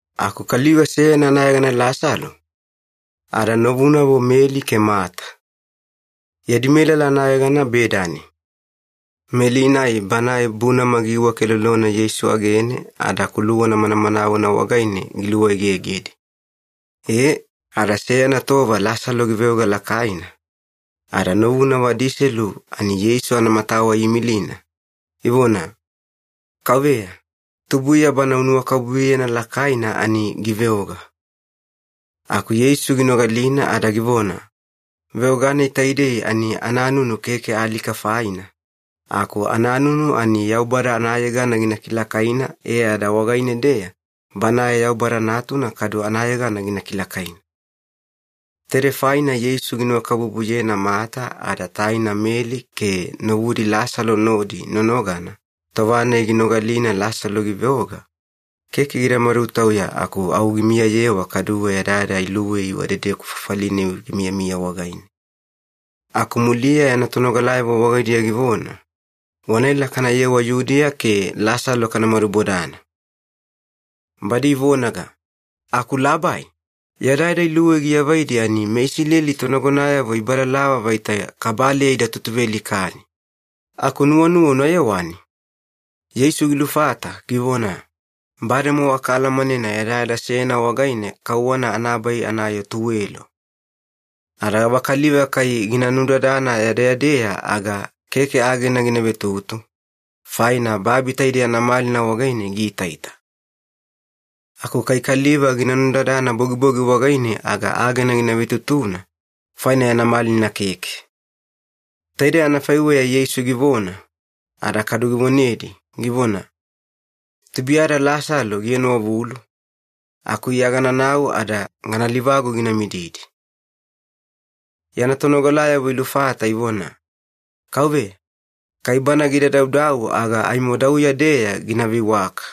Aku kaliva seyana anayegana Lasalo, ada novunavo Meli ke Mata. Yadi melala anayegana Bedani. Meli-nai banae bunama giiwakelolona Yeisu agene ada kuluwana manamanawena wagaine giluegegedi. E, ada seyana tova Lasalo giveoga lakaina, ada novunavo adiselu ani Yeisu anamatawa iimilina, ivona, “Kauveya, tubuiya bana unuwakabubuyena lakaina ani giveoga.” Aku Yeisu ginogalina ada givona, “Veoga-nai taidei ani ananunu keke alika faina, aku ananunu ani Yaubada anayegana gina kilakaina e ada wagaine-deya Banae Yaubada Natuna kadu anayegana gina kilakaina.” Taidei faina Yeisu ginuwakabubuyena Mata ada taina Meli ke novudi Lasalo nodi nonogana tova-nai ginogalina Lasalo giveoga, keke gida madutauya aku au gimiyayewa kaduwe yadayada iluwei wadedeku fafali-nai gimiyamiya wagaine. Aku muliya yana tonogalayavo wagaidiya givona, “Wanaela kanayewa Yudiya ke Lasalo kana madubodana.” Badi ivonaga, “Aku Labai, yadayada iluwei giavaidi ani meIsileli tonagonayavo ibalalava vaita kabaleya ida tutuvealikani. Aku nuwanuwa una yewani?” Yeisu gilufata givona, “Bademowa kaalamanena yadayada seyana wagaine kauwana anabai anayoo tuwelo. Ada gavakaliva kai gina nudadana yadeyadeya aga keke agena gina vetutu, faina babi taidei anamalina wagaine giitaita. Aku kai kaliva gina nudadana bogibogi wagaine aga agena gina vetutuna, faina yana malina keke.” Taidei anafaiweya Yeisu givona, ada kadu givonedi, givona, “Tubuiyada Lasalo gienowavulu, aku Iya gananau ada gana livagu gina mididi.” Yana tonogalayavo ilufata ivona, “Kauveya, kai bana gida daudau aga aimo dauya-deya gina veiwaka.”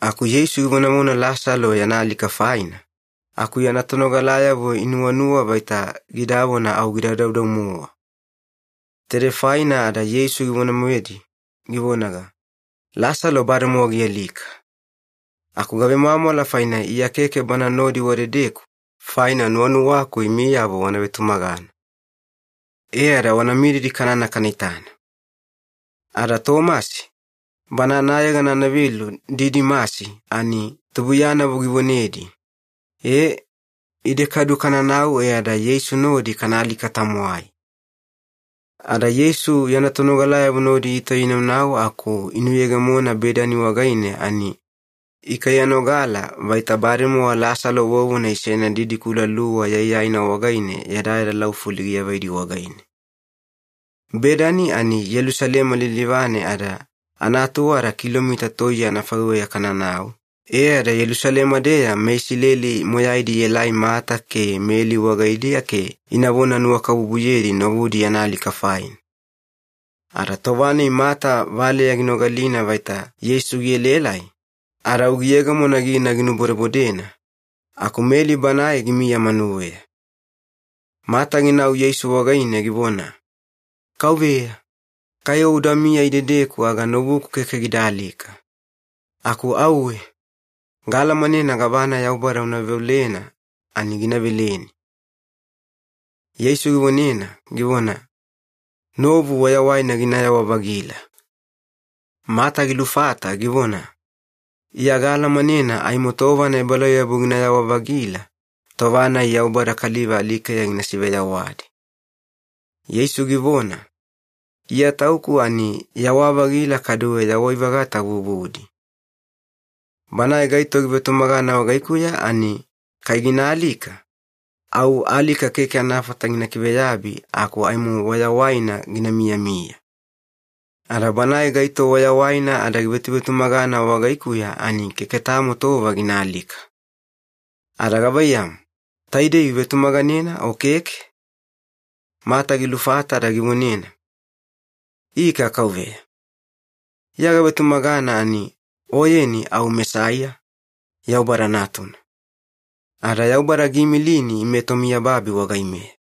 Aku Yeisu givonavona Lasalo yana alika faina, aku yana tonogalayavo inuwanuwa vaita gidavona au gida daudau-mowa. Taidei faina ada Yeisu givone-moedi givonaga, “Lasalo bademowa gialika. Aku gavemwamwala faina Iya keke bana nodi wadedeku, faina nuwanuwaku imiyavo wana vetumagana. E ada wana mididi kanana kana itana.” Ada Tomasi, bana anayegana anavelu Didimasi ani tubuiyanavo givonedi, “E, ide kadu kananau e ada Yeisu nodi kana alika-tamwai.” Ada Yeisu yana tonogalayavo nodi itauya inaunau aku inuyegemona Bedani wagaine ani ikaiyanogala vaita bademowa Lasalo vovona isena didikula luwa yaiyaina wagaine yadayada laufuli giavaidi wagaine. Bedani ani Yelusalema lilivane ada anaatuwada kilomita toiye anafaiweya kananau, e ada Yelusalema-deya meIsileli moyaidi ielai Mata ke Meli wagaidiya ke inavona nuwakabubuyedi novudi yana alika faina. Ada tova-nai Mata valeya ginogalina vaita Yeisu gielaelai, ada au giyegemona gina ginubodebodena, aku Meli banae gimiya manuweya. Mata ginau Yeisu wagaine givona, “Kauveya, kai O udamiya idedeku aga novuku keke gida alika. Aku auwe, gaalamanena gavana Yaubada una veolena ani gina veleni.” Yeisu givonena, givona, “Novu wayawaina ginayawa-vagila.” Mata gilufata givona, “Iya gaalamanena aimo tova anaebalauyabu ginayawa-vagila, tova-nai Yaubada kaliva alikeya gina siveyawadi.” Yeisu givona, “Iya Tauku ani yawa-vagila kaduwe yawai-vagata vuvudi. Banae gaito givetumagana wagaikuya ani kai gina alika, au alika keke anafata gina kiveyabi aku aimo wayawaina gina miyamiya. Ada banae gaito wayawaina ada givetuvetumagana wagaikuya ani keke tamo tova gina alika. Ada gavaiyamu, taidei uvetumaganena o keke?” Mata gilufata ada givonena, “Ika Kauveya, Iya gavetumagana ani Oyeni au Mesaiya, Yaubada Natuna. Ada Yaubada giimilini ime tomiyababi wagaimeya.”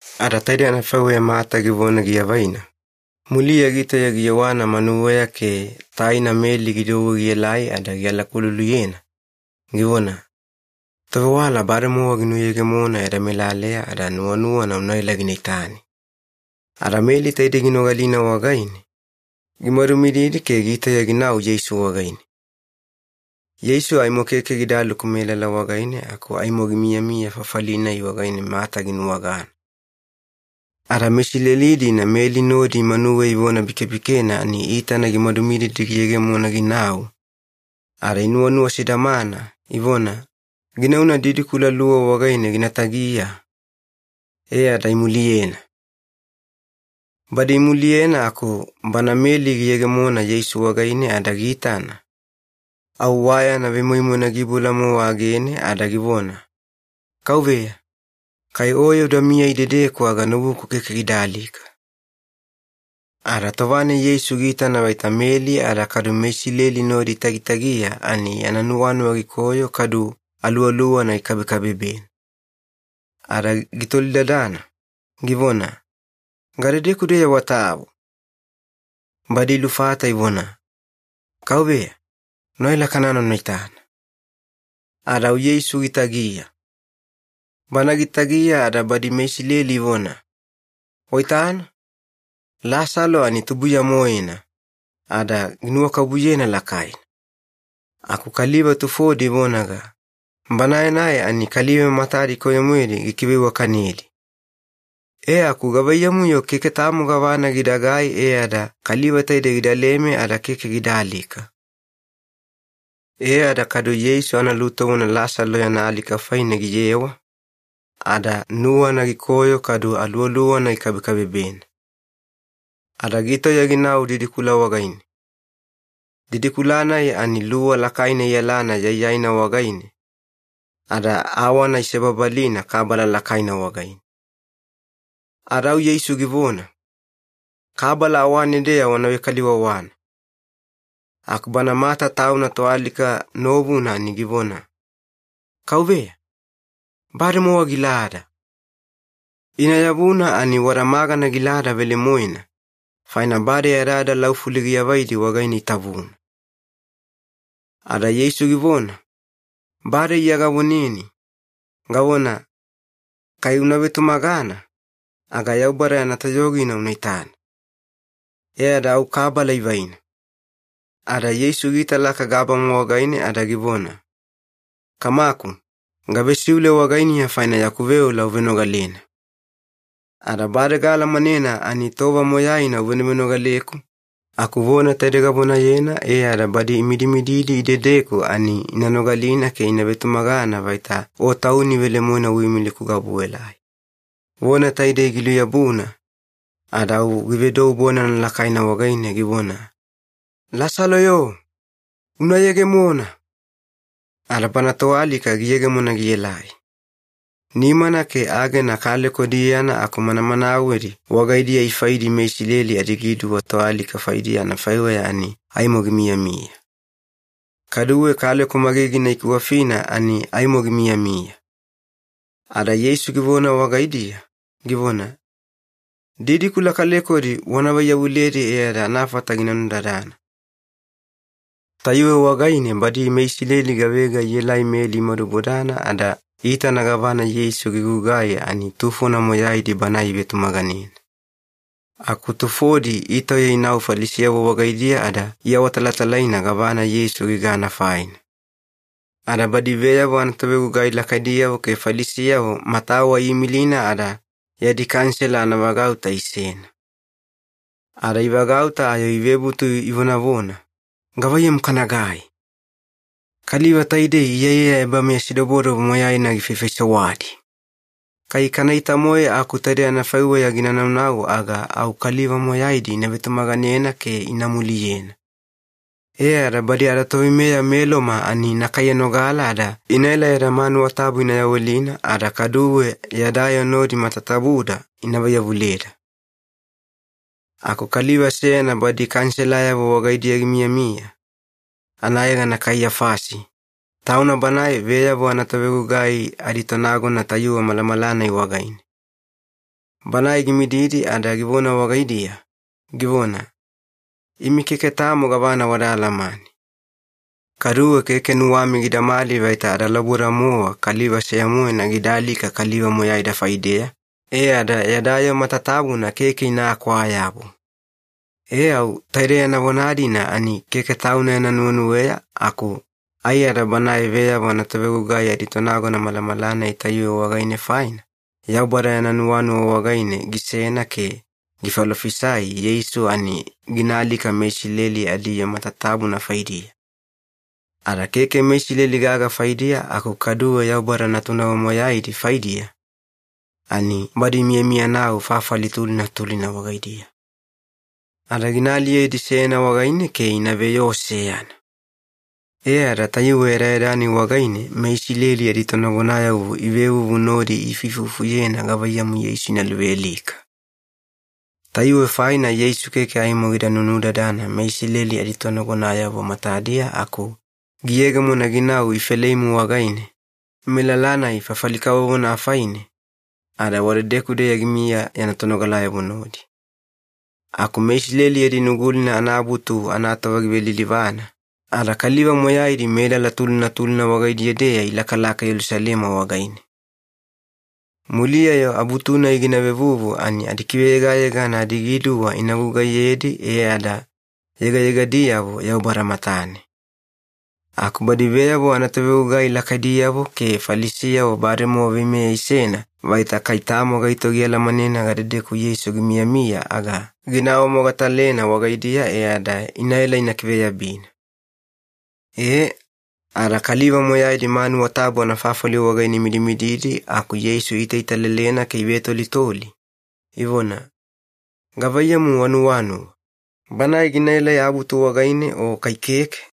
Ada taidei anafaiweya Mata givona giavaina, muliya gitauya giyewana manuweya ke taina Meli gidouwe gielai ada gialakululuyena, givona, “Tovewala bademowa ginuyegemona yada melaleya ada nuwanuwana unaela gina itani.” Ada Meli taide ginogalina wagaine, gimadumididi ke gitauya ginau Yeisu wagaine. Yeisu aimo keke gidaluku melala wagaine aku aimo gimiyamiya fafali-nai wagaine Mata ginuwagana. Ada meIsileli-dina Meli nodi manuweya ivonabikebikena ani iitana gimadumididi giyegemona ginau, ada inuwanuwa sidamana, ivona, “Ginauna didikula luwa wagaine gina tagiya,” e ada imuliyena. Badi imuliyena aku bana Meli giyegemona Yeisu wagaine ada giitana, au wa yana vemoimoina giiboula-mowa agene ada givona, “Kauveya, kai Oye udamiya idedeku aga novuku keke gida alika.” Ada tova-nai Yeisu giitana vaita Meli ada kadu meIsileli nodi itagitagiya ani yana nuwanuwa gikoyo kadu aluwaluwana gikabekabebena. Ada gitolidadana, givona, “Gadedeku-deya watavu?” Badi ilufata ivona, “Kauveya, unaela kanana una itana.” Ada au Yeisu gitagiya. Bana gitagiya ada badi meIsileli ivona, “Waitana, Lasalo ani tubuiya-moena, ada ginuwakabubuyena lakaina.” Aku kaliva tufodi ivonaga, “Banae-nai ani kaliva matadi koyo-moedi gikiveiwakanedi. E aku gavaiyamu-yo keke tamo gavana gidagai e ada kaliva taidei gidaleme ada keke gida alika?” E ada kadu Yeisu analutovona Lasalo yana alika faine giyewa, ada nuwana gikoyo kadu aluwaluwana gikabekabebena. Ada gitauya ginau didikula wagaine. Didikula-nai ani luwa lakaina iyalana yaiyaina wagaine, ada awana isebabalina kabala lakaina wagaine. Ada au Yeisu givona, “Kabala awane-deya wana vekaliwawana.” Aku bana Mata tauna toalika novuna ani givona, “Kauveya, bademowa gilada. Ina yavuna ani wada magana gilada velemoena, faina bade yadayada laufuli giavaidi wagaine itavuna.” Ada Yeisu givona, “Bade Iya gavoneni, gavona, ‘Kai una vetumagana, aga Yaubada yana toyogina una itana.’” E ada au kabala ivaina. Ada Yeisu giitalaka gabama wagaine ada givona, “Kamaku, gavesiule wagainiya faina yaku veola uvenogalena. Ada bade gaalamanena ani tova moyaina uvenovenogaleku, aku vona taide gavonayena e ada badi imidimididi idedeku ani ina nogalina ke ina vetumagana vaita O Tauni velemoena uimiliku gaobuelai.” Vona taidei giluyabuna, ada au givedou bonana lakaina wagaine, givona, “Lasalo-yo, una yegemona!” Ada bana toalika giyegemona gielai. Nimana ke agena kaleko diyana aku manamanawedi wagaidiya ifaidi meIsileli adigiduwa toalika faidiya anafaiweya ani aimo gimiyamiya. Kaduwe kaleko magigina ikiwafina ani aimo gimiyamiya. Ada Yeisu givona wagaidiya, givona, “Didikula kalekodi wana vaiyavuledi e ada anafata gina nudadana.” Tayuwe wagaine badi meIsileli gavega ielai Meli imadubodana ada iitana gavana Yeisu gigugai ani tufona moyaidi Banae ivetumaganena. Aku tufodi itauya inau Falisiyavo wagaidiya ada iawatalatalaina gavana Yeisu gigana faina. Ada badi veyavo anatovegugai lakaidiyavo ke Falisiyavo matawa iimilina ada yadi Kanisela anavagauta isena. Ada ivagauta ayo ivebutu ivonavona, “Gavaiyamu kanagai? Kaliva taidei iyaiyaya ebameyasidobodobo moyaina gifaifaisewadi! Kai kanaita-moe aku taidei anafaiweya gina naunau aga au kaliva moyaidi ina vetumaganena ke ina muliyena. E ada badi adatoveimeya meLoma ani ina kaiyanogala ada inaela yada manuwa tabu ina yawelina ada kaduwe yada yoo nodi matatabuda ina vaiyavuleda.” Aku kaliva seyana badi Kaniselayavo wagaidiya gimiyamiya, anayegana Kaiyafasi, tauna banae veyavo anatovegugai aditonagona tayuwe malamala-nai wagaine. Banae gimididi ada givona wagaidiya, givona, “Imi keke tamo gavana wada alamane. Kaduwe keke nuwami gidamali vaita adalauboda-mowa kaliva seya-moena gida alika kaliva moyaida faideya, e ada yada yoo matatabuna keke inakwaa-yabu.” E au taide yana vona-dina ani keke tauna yana nuwenuweya aku aiyada banae veyavo anatovegugai aditonagona malamala-nai tayuwe wagaine faina, Yaubada yana nuwanuwa wagaine gisena ke gifalofisai Yeisu ani gina alika meIsileli adiyoo matatabuna faidiya. Ada keke meIsileli gaga faidiya aku kaduwe Yaubada natunavo moyaidi faidiya, ani badi imiyamiyanau fafali tulina tulina wagaidiya. Ada gina aliyedi seyana wagaine ke ina veyoo seyana. E ada tayuwe yadayada-nai wagaine meIsileli aditonagonayavo ivevuvu nodi iifuifufuyena gavaiyamu Yeisu ina luvealika. Tayuwe faina Yeisu keke aimo gida nunudadana meIsileli aditonagonayavo matadiya aku giyegemona ginau Ifeleimu wagaine, melala-nai fafali kavovona afaine, ada wadedeku-deya gimiya yana tonogalayavo nodi. Aku meIsileli yadi Nugulina anaAbutu anatova givelilivana, ada kaliva moyaidi melala tulina tulina wagaidiya-deya ilakalaka Yelusalema wagaine. Muliya-yo Abutu-nai gina vevuvu ani adikiveyegayegana adigiduwa ina gugaiyedi e ada yegayegadiyavo Yaubada matane. Aku badi veyavo anatovegugai lakaidiyavo ke Falisiyavo bademowa veimeya isena vaita kai tamo gaito gialamanena gadedeku Yeisu gimiyamiya aga gina awamogatalena wagaidiya e ada inaela ina kiveyabina. E, ada kaliva moyaidi manuwa tabu anafafali wagaine imidimididi aku Yeisu iitaitalelena ke ivetolitoli, ivona, “Gavaiyamu wanuwanuwa, Banae ginaelai Abutu wagaine o kai keke?”